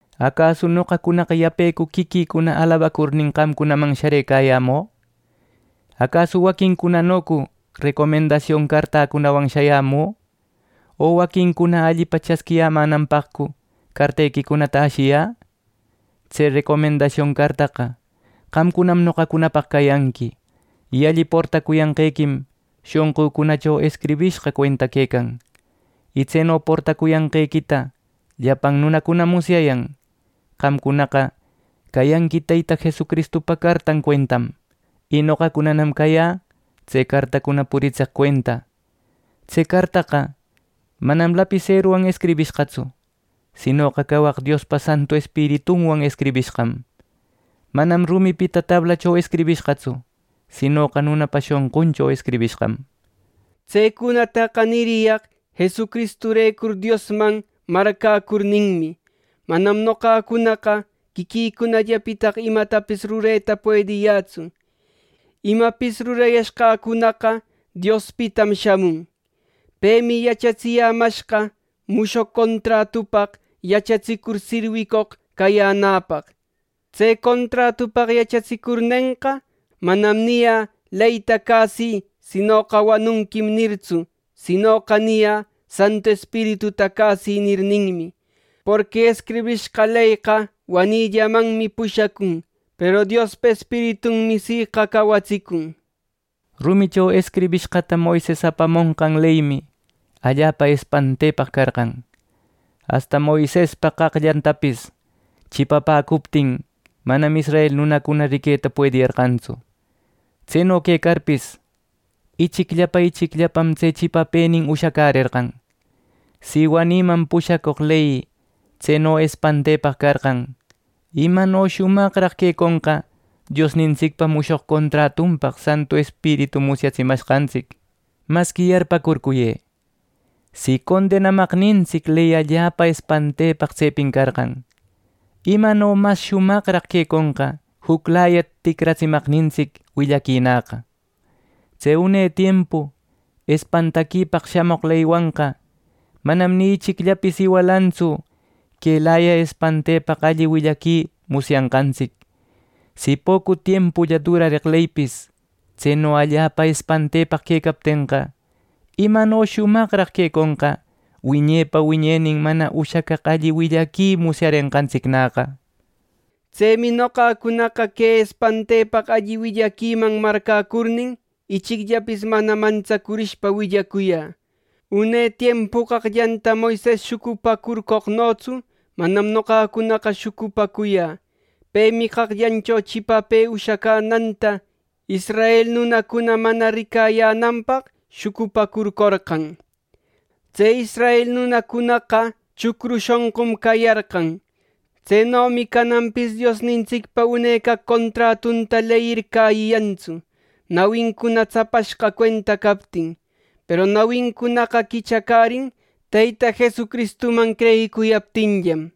¿Acasu noqacunaqa yapecu quiquïcuna alabacurnin qamcunman sharëcayämü? ¿Acasu waquincunanocu recomendasion cartäcunawan shayamü? ¿O waquincuna allipa chasquiyämänanpaqcu cartequicunata ashiyä? Tse recomendasion cartaqa qamcunam noqacunapaq cayanqui, y alli portacuyanqequim shonqücunacho escribishqa cuenta quecan. Y tseno portacuyanqequita llapan nunacunam musyayan. Qamcunaqa cayanqui Teyta Jesucristupa cartan cuentam, y noqacunanam cayä tse cartacuna puritseq cuenta. Tse cartaqa manam lapiseruwan escribishqatsu, sinoqa cawaq Diospa Santu Espiritunwan escribishqam. Manam rumipita tablacho escribishqatsu, sinoqa nunapa shonquncho escribishqam. Tsecunataqa niriyaq Jesucristurecur Diosman marcäcurninmi. Manam noqacunaqa quiquïcunallapitaqa imatapis rureta puediyätsu; imapis rurayashqäcunaqa Diospitam shamun. Pemi yachatsiyämashqa mushoq contratupaq yachatsicur sirwicoq cayänäpaq. Tse contratupaq yachatsicurnenqa, manam niyä “¡Leyta cäsï, sinoqa wanunquim!” nirtsu; sinoqa niyä “¡Santu Espirituta cäsï!” nirninmi. Porqui escribishqa leyqa wanïllamanmi pushacun, peru Diospa Espiritumi siqa cawatsicun. Rumicho escribishqata Moises apamonqan leymi allapa espantepaq carqan. Asta Moisespa qaqllantapis chipapäcuptin, manam israel nunacuna riqueta puediyarqantsu. Tseno quecarpis, ichicllapa ichicllapam tse chipapënin ushacärerqan. Si wanïman pushacoq ley tseno espantepaq carqan, ¡imano shumaqnaraq queconqa Diosnintsicpa mushoq contratunpaq Santu Espiritu musyatsimanqantsic! Masqui yarpäcurcuyë: Si condenamaqnintsic ley allapa espantepaq tsepin carqan, ¡imano mas shumaqraq queconqa juclaya ticratsimaqnintsic willaquinäqa! Tse une tiempu espantaquipaq shamoq leywanqa, manam ni ichicllapis iwalantsu quelaya espantepaq alli willaqui musyanqantsic. Si pocu tiempulla durareq leypis, tseno allapa espantepaq quecaptenqa, ¿imano shumaqraq queconqa wiñepa wiñenin mana ushacaq alli willaqui musyarenqantsicnäqa! Tsemi noqacunaqa que espantepaq alli willaquiman marcäcurnin, ichicllapis mana mantsacurishpa willacuyä. Une tiempu qaqllanta Moises shucupacurcoqnotsu manam noqacunaqa shucupacuyä. Pemi qaqllancho chipapë ushacänanta israel nunacuna mana ricayänanpaq shucupacurcorqan. Tse israel nunacunaqa, chucru shonqun cayarqan. Tsenomi cananpis Diosnintsicpa une caq contratunta leyir cäyiyantsu, nawincuna tsapashqa cuenta captin; peru nawincunaqa quichacärin Teyta Jesucristuman creyicuyaptinllam.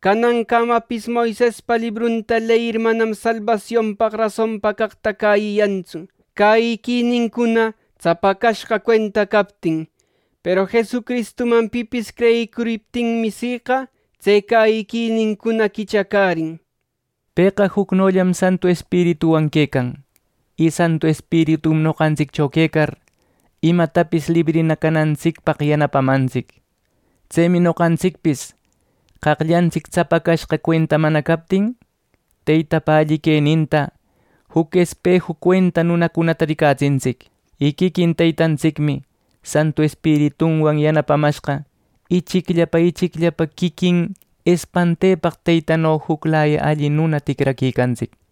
Canancamapis Moisespa librunta leyir manam salbasionpaq rasonpa caqta cäyiyantsu, cäyiquinincuna tsapacashqa cuenta captin. Peru Jesucristuman pipis creyicuriptinmi siqa, tse cäyiquinincuna quichacärin. Pëqa jucnollam Santu Espirituwan quecan. Y Santu Espiritum noqantsiccho quecar, imapitapis librina canantsicpaq yanapamantsic. Tsemi noqantsicpis qaqllantsic tsapacashqa cuenta mana captin, Teytapa alli queninta juc espeju cuenta nunacunata ricatsintsic. Y quiquin Teytantsicmi Santu Espiritunwan yanapamashqa ichicllapa ichicllapa quiquin espantepaq Teytano juclaya alli nuna ticraquicantsic.